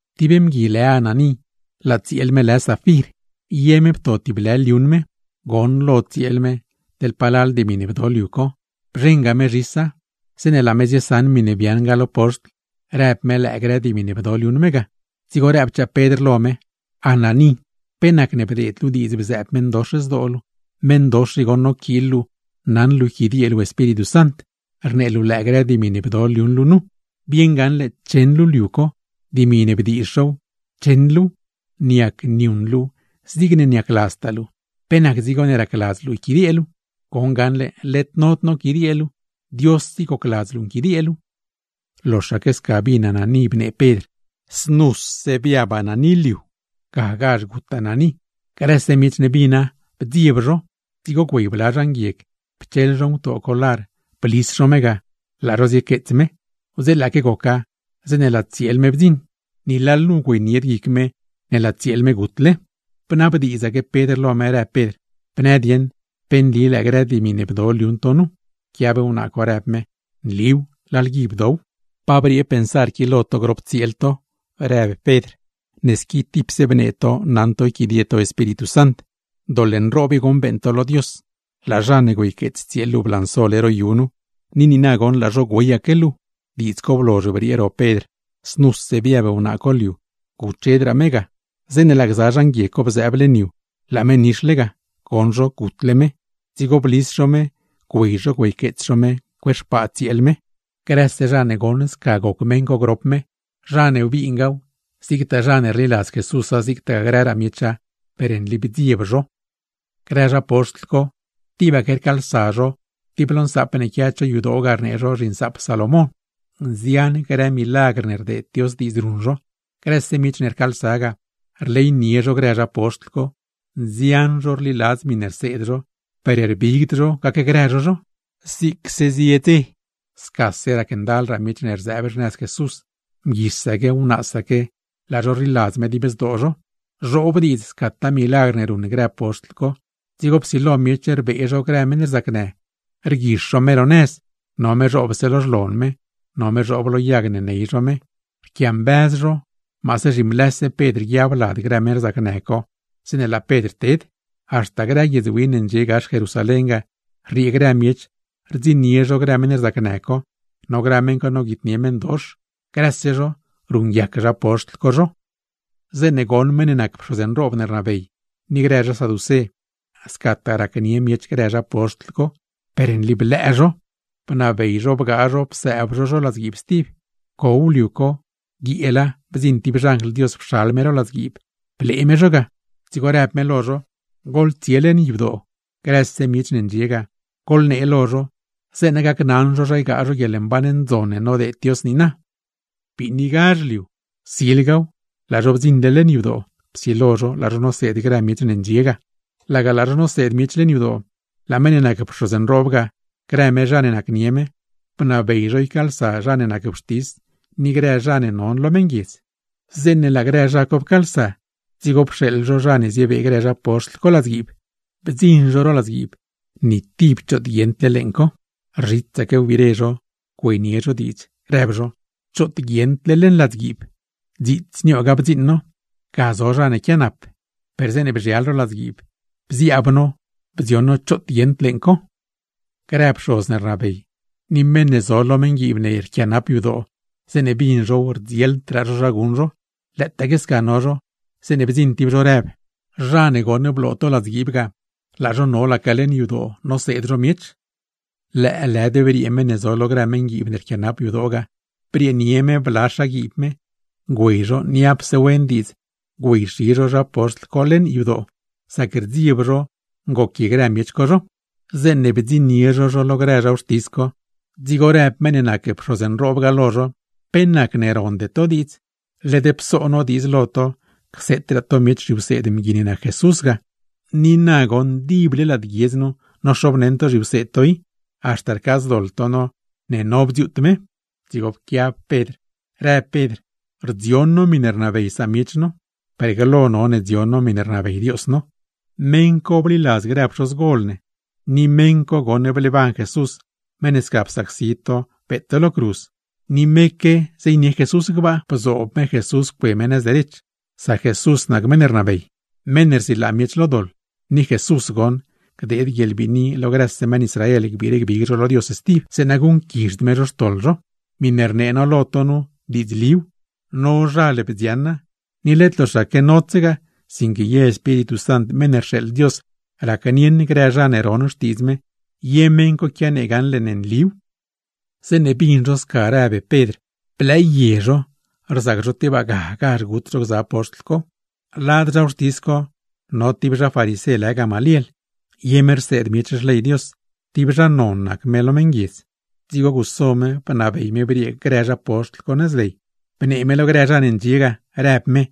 Tib mgui lë Ananí, laa tsieel me lë Safir; ye me pto tib lë liuṉ me. Goṉlo tsieel me, teḻ palal dimi ne bdo liu co, bzheṉga me zhisa. Zeeṉe laa me ziesaṉ miṉe biaaṉ ga, lo poxtl, rëb me lëë grë dimi ne bdo liuṉ me ga. Dzigo rëbchaa Pedr lo me: ―Ananí, ¿pe nacne bdeed luu diidz bzëëb meṉdox zdoo luu? Meṉdox i goṉ noquiil luu naṉ luu yquidiee luu Espíritu Sant, rnee luu lëë grë dimi ne bdo liuṉ luu nu. Bieṉ gaṉle cheṉ luu liu co. Dimi ne bdiizh zhow, cheṉ luuw, niac niuṉ luuw zigne niacladztaa luu, ¿pe nac dzigo ne racladz luu yquidiee luu? Goṉ gaṉle led nod noquidiee luu, Dios i gocladz luu nquidiee luu. Loxaque sca bin Ananí bnee Pedr, znuse biab Ananí liu, gagazh gut Ananí. Grëse miech ne bina, bdzieb zho. Dzigo güey bla zha nguieg pcheḻ zho ngutoo co lar, blis zho me ga laa zho ziequeets me. Wdzeelaaque goca zeeṉe laa tsieel me bdziṉ, ni lalnu güeynied guic me ne laa tsieel me gutle. Bnabdiidzaque Pedr lo me, rëb Pedr: ―Bnë dieṉ, ¿pe nli lëë grë dimi ne bdo liuṉ to nu? Pquiab wnaa co, rëb me: ―Nliw, lalgui pto now. ―¿Pa briee pensar qui lo to grop tsieel to? ―rëb Pedr―. Ne squi tipse bnee to naṉ to yquidie to Espíritu Sant; doḻ nroob i goṉ beeṉ to lo Dios. Laa zha ne güeyqueets tsieel luu blansole ro yu nu, ni niina goṉ laa zho güeyaque luu. Diidz co blozh briee ro Pedr, znuse biab wnaa co liu, guchedraa me ga. Zeeṉe laa gza zha nguieg co bzëëb leṉ yu, laa me nixle ga; goṉ zho gutle me, dzigo blis zho me güey zho güeyqueets zho me cue xpaa tsieel me. Grëse zha ne goṉ sca goc meṉ co grop me, zha ne bingaaw, zigtaa zha ne rliladz Jesúsa zigtagaa grëraa miecha, per nli bdzieb zho. Grë zha poxtl co, tibaque rcaalsa zho tib lo nsaap ne quia cho yadoo ga rnee zho zhiNsaap Salomón; nzian grë milagr ne rdeed Dios diidz ruṉ zho. Grëse miech ne rcaalsa ga, rleynie zho grë zha poxtl co, nzian zho rliladz miṉe rseed zho, per rbigd zho gacgrë zho zho. Zigse zie dze, scase racndalraa miech ne rzëëb xnëz Jesús, mguisaque wnaasaque laa zho rliladz me dib zdoo zho. Zhoob diidz scataa milagr ne ruṉ grë zha poxtl co. Dzigo psilo miech rbee zho grë meṉ rzacnë, rguix zho me ro nëz, no me zhoobse lo xlon me, no me zhoob lo yag ne ney zho me; rquiambëz zho maase zhimlëse Pedr guiab lad grë meṉ co zeeṉe laa Pedr ted. Haxta grë guiedz win ne ndxie gax Jerusalén ga, rriee grë miech rdziṉnie zho grë meṉ rzacnë, no grë meṉ co noguitnie meṉdox; grëse zho ruṉguiac zha poxtl co zho. Zeeṉe goṉ meṉ ne nac pxoz nroob ne rnabey, ni grë zha saducé, scataa racnie miech grë zha poxtl co, per nli blëë zho, bnabey zho bgaa zho psëëb zho zho ladzguiib stib. Pcow liu co, guieela bdziṉ tib xanjl Dios pxal me ro ladzguiib, blee me zho ga; dzigo rëb me lo zho: ―Goḻtsie leṉ yadoo, grëse miech ne ndxie ga goḻnee lo zho, zeeṉa gacnaṉ zho zha ygaa zho guieḻmban ndzon ne nodeed Dios niina. Biinigazh liu, silgaw laa zho bdziṉle leṉ yadoo; psilo zho laa zho noseed grëse miech ne ndxie ga. Laga laa zho noseed miech leṉ yadoo, laa meṉ ne nac pxoz nroob ga, grë me zha ne nacnie me, bnabey zho ycaalsa zha ne nac wxtis ni grë zha non lo meṉguiedz. Zeeṉe laa grë zha co pcaalsa, dzigo pxeeḻ zho zha ne ziebee grë zha poxtl co ladzguiib. Bdziṉ zho ro ladzguiib, ni tib choot guieṉd leeṉ co; rzhitsaque wbire zho güeynie zho diidz, rëb zho: ―¡Choot guieṉd leṉ ladzguiib! Dziits niooga bdziṉ no, ga zo zha ne quianap; per zeeṉe bzhial ro ladzguiib bziaab no, bdzioṉ no choot guieṉd leeṉ co. Grë pxoz ne rnabey, ni meṉ ne zo lo meṉguiib ne rquianap yadoo, zeeṉe bin zhow, rdzieldraa zho zha guṉ zho. Lëëtaaque sca no zho, zeeṉe bdziṉ tib zho rëb: ―Zha ne goṉ bloo to ladzguiib ga, laa zho nolaque leṉ yadoo noseed zho miech. Lëëlëd briee meṉ ne zo lo grë meṉguiib ne rquianap yadoo, brieenie me bla xaguiib me, güey zho niapse wen diidz güeyxi zho zha poxtl co leṉ yadoo; sac rdzieb zho ngoquie grë miech co zho. Zeeṉe bdziṉnie zho zho lo grë zha wxtis co, dzigo rëb meṉ ne nac pxoz nroob ga lo zho: ―¿Pe nacne ronde to diidz? Led pso no diidz lo to cseetraade to miech zhiwseed mgui ne nac Jesús ga. Ni na goṉ dible lad guiedz nu nozhoobneṉ zhiwseed to i, haxta rcaadzdoḻ to no ne no bdziuut me. Dzigo pquiab Pedr rëb Pedr: ―Rdzion no miṉe rnabey samiech no, per glo none dziuuṉ no miṉe rnabey Dios no. Meṉ co bliladz grë pxozgol ne, ni meṉ co goṉ bleeban Jesús, meṉ ne sca psacsi to beet to lo cruz. Ni meque zeynie Jesús gbaa, bzoob me Jesús cue me nëz derech; sac Jesús nac meṉ ne rnabey, meṉ ne rsilaa miech lo doḻ. Ni Jesús goṉ, gdeed guieḻbiini lo grëse meṉ Israel gbiire gbig zho lo Dios stib; zeeṉa guṉquizhd me zho xtoḻ zho. ’Miṉe rnee no lo to nu diidzliw, nozhal bdzioṉa, ni led loxaque nodsegaa; sinque ye Espíritu Sant meṉ ne rxeeḻ Dios racnieṉ grë zha ne ron xtiidz me, ye meṉ co quianee gaṉle ne nliw. Zeeṉe bin zho sca rëb Pedr, blëëye zho, rzac zho tebaa gagazh gut zho gza zha poxtl co. Lad zha wxtis co no tib zha farisé lë Gamaliel, ye me rseed miech Xley Dios, tib zha non nac me lo meṉguiedz; dzigo guso me bnabey me briee grë zha poxtl co nëz ley, bnee me lo grëraa zha ne ndxie ga, rëb me: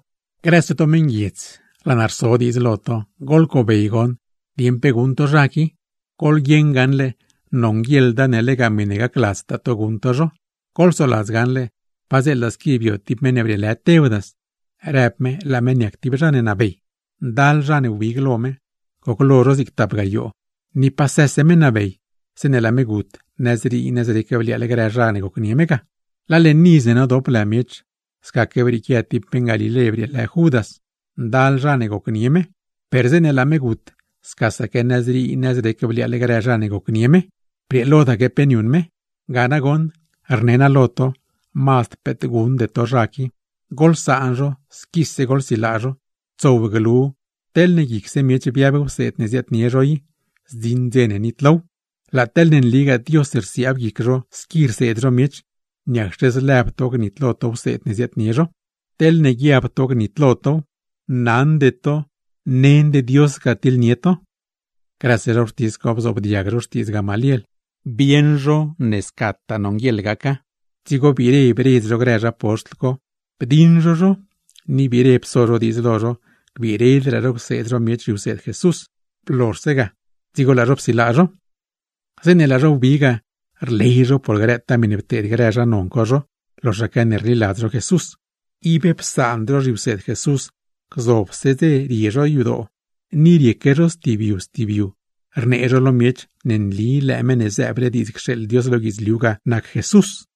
―Grëse to meṉguiedz, laa naa rso diidz lo to, goḻcobey goṉ dieṉ pe guṉ to zha qui. Goḻguieṉ gaṉle, nonguieḻda ne lega miṉe gacladztaa to guṉ to zho. Goḻsoladz gaṉle, padzeela squi bio tib meṉ ne brieelë Teudas, rëb me laa me niac tib zha ne nabey, ndal zha ne wbig lo me, goclo zho zig tap gayoo. Ni pasë me nabey, zeeṉe laa me gut nëzrii nëzrec bliaaḻ grë zha ne gocnie me ga. Laa leṉ iz ne nodop lë miech, scaque brieequia tib meṉ Galilé brieelë Judas. Ndal zha ne gocnie me, per zeeṉe laa me gut scasaque nëzrii, nëzrec bliaaḻ grë zha ne gocnie me; brieelodaque pe niuṉ me. Gane nagoṉ rne naa lo to, mazd peet guṉde to zha qui, goḻsaan zho squise goḻsilaa zho. Tsow glu teḻne guicse miech biab wseed ne ziaadnie zho i, zdziṉ dze ne nitlow. Laa teḻne nligaa Dios rsiaab guic zho squi rseed zho miech, niacxe zlëb to gnitlo to wseed ne ziaadnie zho. ¡Teḻne guiab to gnitlo tow, naṉde to nend Dios ga tiḻnie to! Grëse zha wxtis co bzoobdiag zho xtiidz Gamaliel, bieṉ zho ne scataa nonguieḻ gaca. Dzigo biire bredz zho grë zha poxtl co, bdiṉ zho zho, ni biire pso zho diidz lo zho gbiiredraa zho cseed zho miech zhiwseed Jesús. Blozhse ga, dzigo laa zho psilaa zho. Zeeṉe laa zho wbi ga, rley zho por grëtaa miṉe pteed grë zha non co zho loxaque ne rliladz zho Jesús. Ib psaand zho zhiwseed Jesús, gzobse dze rie zho yadoo ni rieque zho stib yu stib yu, rnee zho lo miech ne nli lëë Meṉ ne zëëble diidz cxeeḻ Dios lo guidzliu ga nac Jesús.